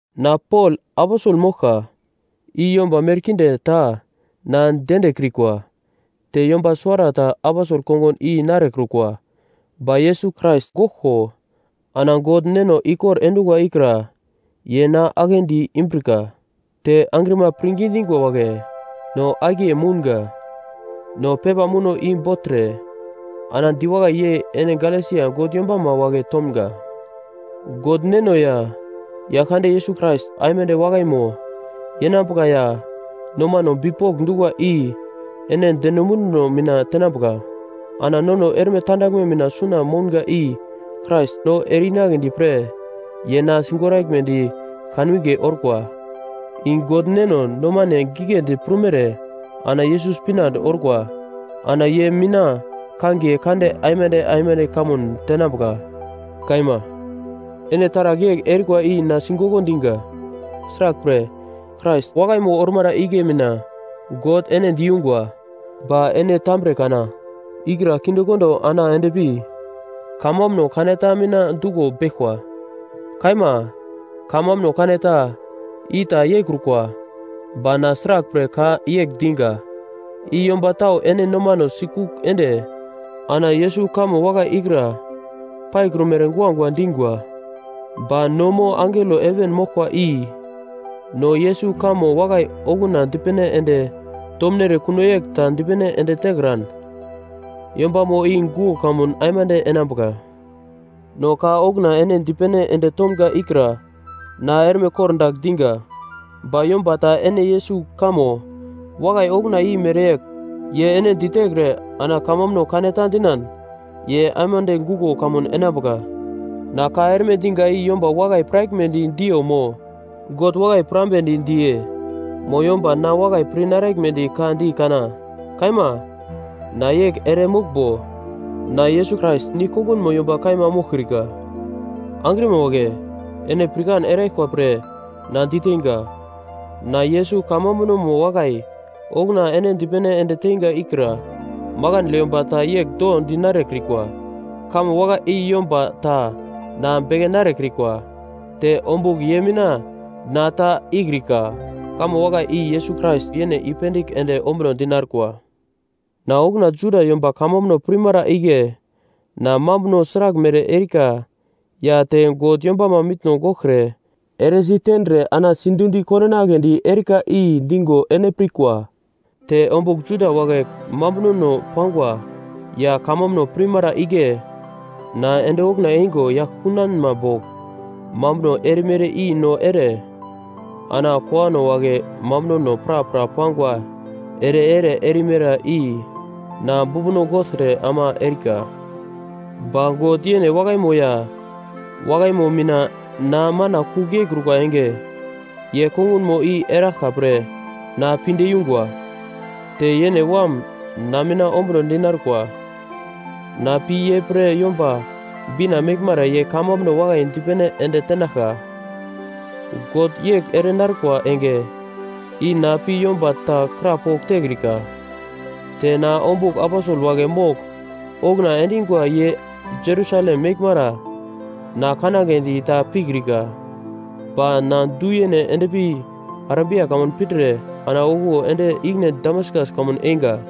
Na Pol, aposel moglka, i yomba merkinde ta na diendekrikwa te yomba suwarata aposel kongun i narekrukwa, ba Yesus Krais goglko ana God Neno ikor endungwa ikra ye na aglendi imbrika, te angrima pirngi dingwa wagle no akiye mounga. No pepa muno i bogltre ana diwakai yei ene Galesia God yombama wagle tomga: God Neno ya Yaglkande Yesus Krais aimande wakaimo yenambuka ya nomane bipok dungwa i ene deno munduno mina tenambuka. Ana nono erme tandaglme mina suna mounga i Krais no ere-inagle pre ye na sigoraglmedi kanwinge orkwa, i God Neno nomane giglendi prumere ana Yesus pinande orkwa. Ana ye mina kangiye kande aimande aimande kamun tenamga. Kaima. Ene taragl yegl erikwa i na sigok diga. Sraglpre, Krais wakaimo ormara igle mina God ene diyungwa, ba ene tambre kana ikra kindekondo ana endpi kamambuno kaneta mina duglo beglkwa. Kaima, “Kamambuno kaneta” i ta yeikrukwa, ba na sraglpre ka yegl diga, i yomba tau ene nomano sikugl ende ana Yesus kamo wakai ikra paikrumere guagua dingwa. Ba no mo angelo heven moglkwa i no Yesus kamo wakai okuna dipene ende tomnere kuno yegl ta dipene ende tekran, yombamo i guglo kamun aimande enambuka. No ka okuna ene dipene ende tomga ikra na erme kordagl diga: Ba yomba ta ene Yesus kamo wakai okuna i mereyegl ye ene ditekre ana kamambuno kaneta dinan, ye aimande guglo kamun enambuka! Na ka erme diga i yomba wakai piraglmedi diyo mo, God wakai pirambedi diye? Mo yomba na wakai pir naraglmedi ka di kana? Kaima, na yegl ere moglmbo, na Yesus Krais nigl-kongunmo yomba kaima moglkrika. Angrima wagle, ene pirkan eraglkwa pre na diteinga. Na Yesus kamambunomo wakai okuna ene dipene ende teinga ikra makandle yomba ta yegl do dinarekrikwa. Kamo wakai i yomba ta na beke narekrikwa, te ombugl ye mina na ta ikrika. Kamo wakai i Yesus Krais yene i-pendigl ende ombunodi narkwa. Na okuna Juda yomba kamambuno pirmara igle na mambuno sraglmere erika ya te God yombama mitno goglkre eresi tendre ana sidundi kondinagledi erika i digo ene pirkwa. Te ombugl Juda wagle mambunono pangwa ya kamambuno pirmara igle na ende okuna eingo yagl kunanma bogl mambuno erimere i no ere, ana kowano wagle mambunono prapra pangwa ere-ere erimere i na bumbuno gogltre ama erika. Ba God yene wakaimo ya wakaimo mina na mana kugl yeikrukwa enge, ye kongunmo i eraglka pre na pinde yungwa. Te yene Wam na mina ombuno dinarkwa, na pi ye pre Yomba Bina meglmara ye kamambuno wakai dipene ende tenaglka, God yegl ere narkwa enge i na pi yomba ta krapogl tekrika. Te na ombugl aposel wagle mogl okuna endingwa ye Jerusalem meglmara na kanagledi ta pikrika. Ba na du yene endpi Arabia kamun pindre ana okuwo ende ikine Damaskas kamun einga.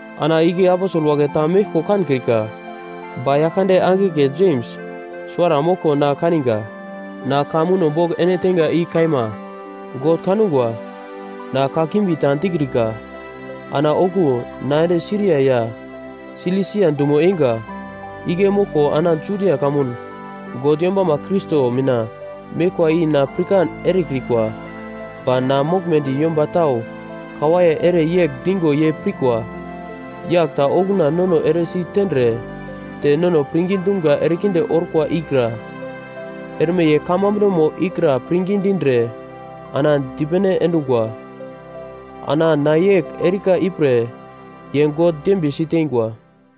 Ana igle aposel wagle ta meglko kankrika, ba Yaglkande angigle Jems suwara moglko na kaniga. Na ka muno bogl ene teinga i kaima. God kangwa na kakimbi ta dikrika. Ana okuwo na ende Siria ya Silisia dumo einga. Igle moglka enge Judia kamun God yombama Krais mina meglkwa i na pirkan erekrikwa. Ba na moglmedi yomba tau kawaiye ere yegl digo ye pirkwa: “Yagl ta okuna nono eresi tendre te nono pirngi dumga erekinde orkwa ikra erme ye kamambunomo ikra pirngi dindre ana dipene endungwa.” Ana na yegl erika ipre ye God dembiye siteingwa.